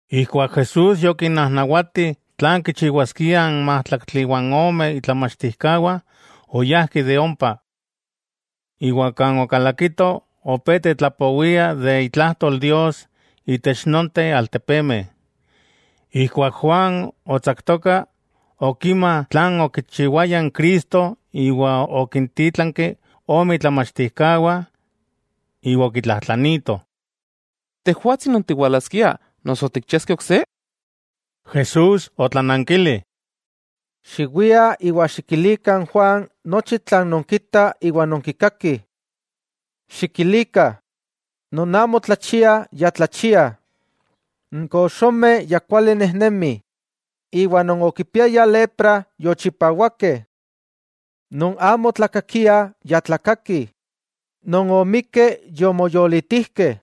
Ijkuak Jesús yokinnajnawati tlan kichiwaskiah n májtlaktli iwa ome itlamachtijkawah, oyajki de ompa. Iwa kan okalakito opé tetlapowia de itlajtol Dios itech nonteh altepemeh. Ijkuak Juan otsaktoka, okima tlan okichiwaya n Cristo iwa okintítlanki ome itlamachtijkawah. Iwa okitlajtlanitoh: —¿Tejwatsi non tiwalaskia, noso tikchiaskeh ok se? Jesús otlanankili: —Xiwiah iwa xikilikah n Juan nochi tlan nonkitah iwa nonkikakih. Xikilikah, non amo tlachiah ya tlachiah, n koxomeh, ya kuali nejnemih iwa non okipiayah lepra, yochipawakeh. Non amo otlakakiah, ya tlakakih, non omikkeh, yomoyolitijkeh,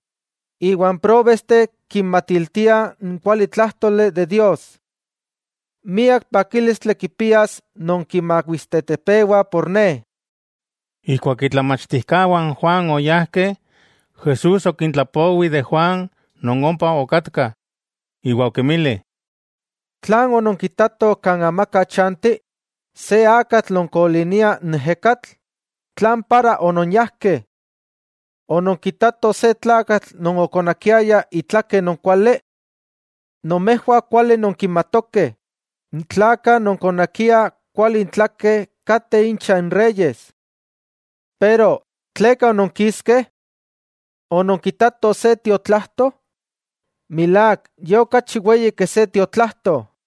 iwa n próbesteh kinmatiltiah n kualitlájtoli de Dios. Miak pakílistli kipias non kimawistetepewa por Ne. Ijkuak itlamachtijkawah n Juan oyajkeh, Jesús okintlapowi de Juan non ompa okatkah, iwa okinmili: —¿Tlan ononkitatoh kan amaka chanti? ¿Se akatl non kolinia n ejekatl? ¿Tlan para ononyajkeh? ¿Ononkitatoh se tlakatl non okonakiaya itlake non kuali? Nomejwah kuali nonkimatokeh, n tlakah non konakiah kuali intlakeh kateh incha n reyes. Pero ¿tleka ononkiskeh? ¿Ononkitatoh se tiotlajto? Milák, ye okachi weyi ke se tiotlajto.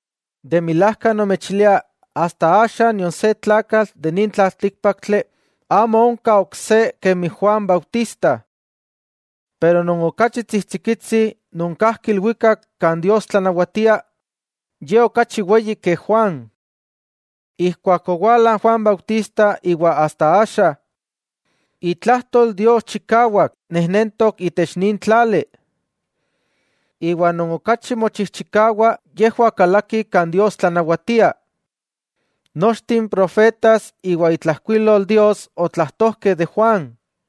De milajka nomechilia asta axa itech nin tlaltíkpaktli amo onka ok se tlakatl kemi Juan Bautista. Pero non okachi tsijtsikitsi non kajki ilwikak kan Dios tlanawatia, ye okachi weyi ke Juan. 'Ijkuak owala Juan Bautista iwa asta axa, itlajtol Dios chikawak nejnentok itech nin tlali. Iwa non okachi mochijchikawah yejwah kalakih kan Dios tlanawatia. Nochteh n profetas iwa itlajkuilol Dios otlajtojkeh de Juan.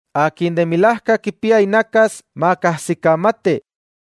'¡Akin de milajka kipia inakas, makajsikamati!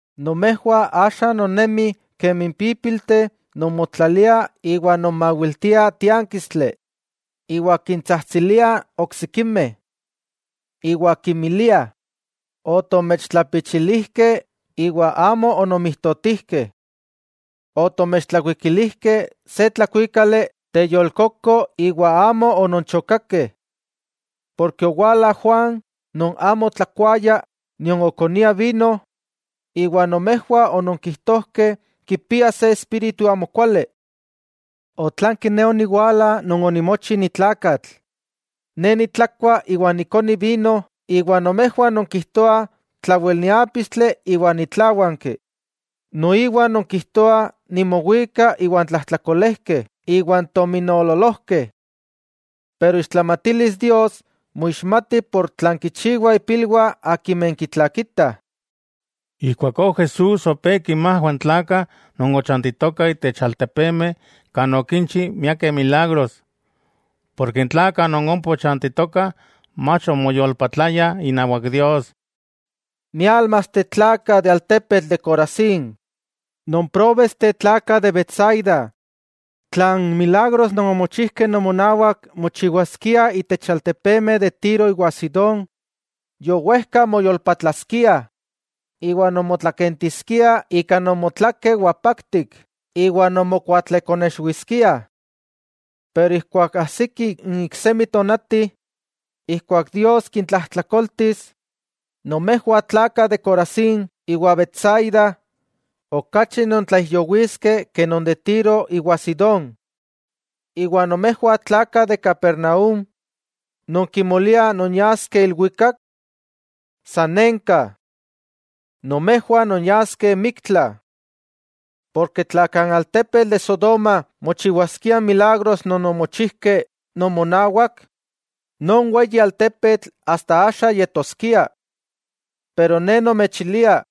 'Nomejwah axa nonnemih kemi n pípilteh non motlaliah iwa nonmawiltiah tiánkistli, iwa kintsajtsiliah oksikimeh, iwa kinmiliah: “Otomechtlapichilijkeh iwa amo ononmijtotijkeh. Otomechtlakuikilijkeh se tlakuikali teyolkoko iwa amo ononchokakeh.” Porke owala Juan, non amo otlakuaya nion okonia vino, iwa nomejwah ononkijtojkeh kipia se espíritu amokuali. Otlanki Ne oniwala Non onimochi ni tlakatl. Ne nitlakua iwa nikoni vino iwa nomejwah nonkijtoah tlawel niápistli iwa nitláwanki. Noiwa nonkijtoah nimowika iwan tlajtlakolejkeh iwa n tominoololojkeh. Pero ixtlamatilis Dios moixmati ika tlan kichiwah ipilwah akimeh kitlakitah. Ijkuakó Jesús opé kinmajwa n tlakah non ochantitokah itech altepemeh kan okinchi miakeh milagros. Porke n tlakah non ompa ochantitokah mach omoyolpatlayah inawak Dios. —¡Miálmasteh tlakah de altepetl de Corazín! ¡Nonpróbesteh tlakah de Betsaida! Tla n milagros non omochijkeh nomonawak mochiwaskiah itech altepemeh de Tiro iwa Sidón, yowejka moyolpatlaskiah, iwa nonmotlakentiskiah ika nomotlakeh wapaktik iwa nonmokuatlekonexwiskiah. Pero ijkuak ajsiki n iksemi tonati ijkuak Dios kintlajtlakoltis, nomejwah tlakah de Corazín iwa Betsaida, okachi nontlaijyowiskeh ke non de Tiro iwa Sidón. Iwa nomejwah tlakah de Capernaúm, ¿non kimoliah nonyaskeh ilwikak? ¡Sanenka! Nomejwah nonyaskeh miktla. Porke tla kan altepetl de Sodoma mochiwaskiah n milagros non omochijkeh nomonawak, non weyi altepetl asta axa yetoskia. Pero Ne nomechilia,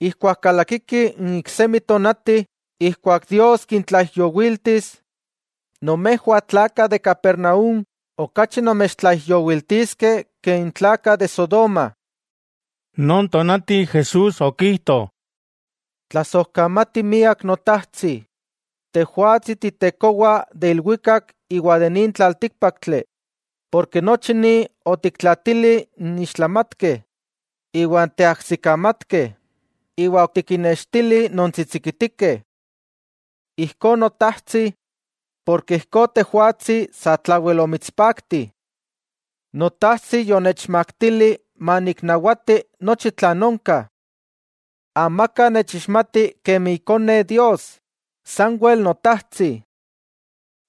ijkuak kalakiki n iksemi tonati ijkuak Dios kintlaijyowiltis, nomejwah tlakah de Capernaúm okachi nomechtlaijyowiltiskeh ke n tlakah de Sodoma. Non tonati, Jesús okijto: —Tlasojkamati miak Notajtsi, Tejwatsi Ti Tekowa de ilwikak iwa de nin tlaltíkpaktli, porke nochi ni otikintlaatili n ixtlamatkeh iwan teajsikamatkeh iwa otikinnextili non tsitsikitikeh. Ijkó Notajtsi, ijkó Tejwatsi satlawel omitspakti. 'Notajtsi yonechmaktili maniknawati nochi tlan onka. Amaka nechixmati kemi Ikone Dios, sanwel Notajtsi.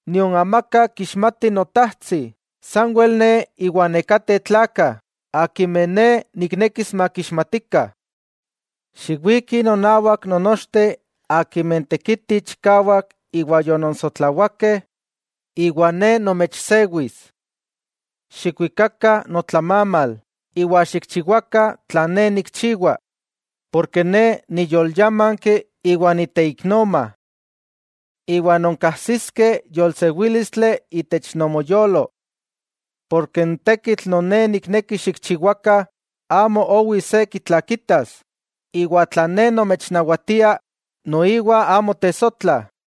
Nion amaka kixmati Notajtsi, sanwel Ne iwa nekateh tlakah akimeh Ne niknekis makixmatikah. Xiwikih nonawak nonnochteh akimeh tekitih chikawak iwa yononsotlawakeh, iwa Ne nomechsewis. Xikwikakah notlamamal, iwa xikchiwakah tlan Ne nikchiwa, porke Ne niyolyámanki iwa niteiknoma. Iwa nonkajsiskeh yolsewílistli itech nomoyolo. Porke n tekitl non Ne nikneki xikchiwakah amo owi se kitlakitas, iwa tlan Ne nomechnawatia, noiwa amo tesotla.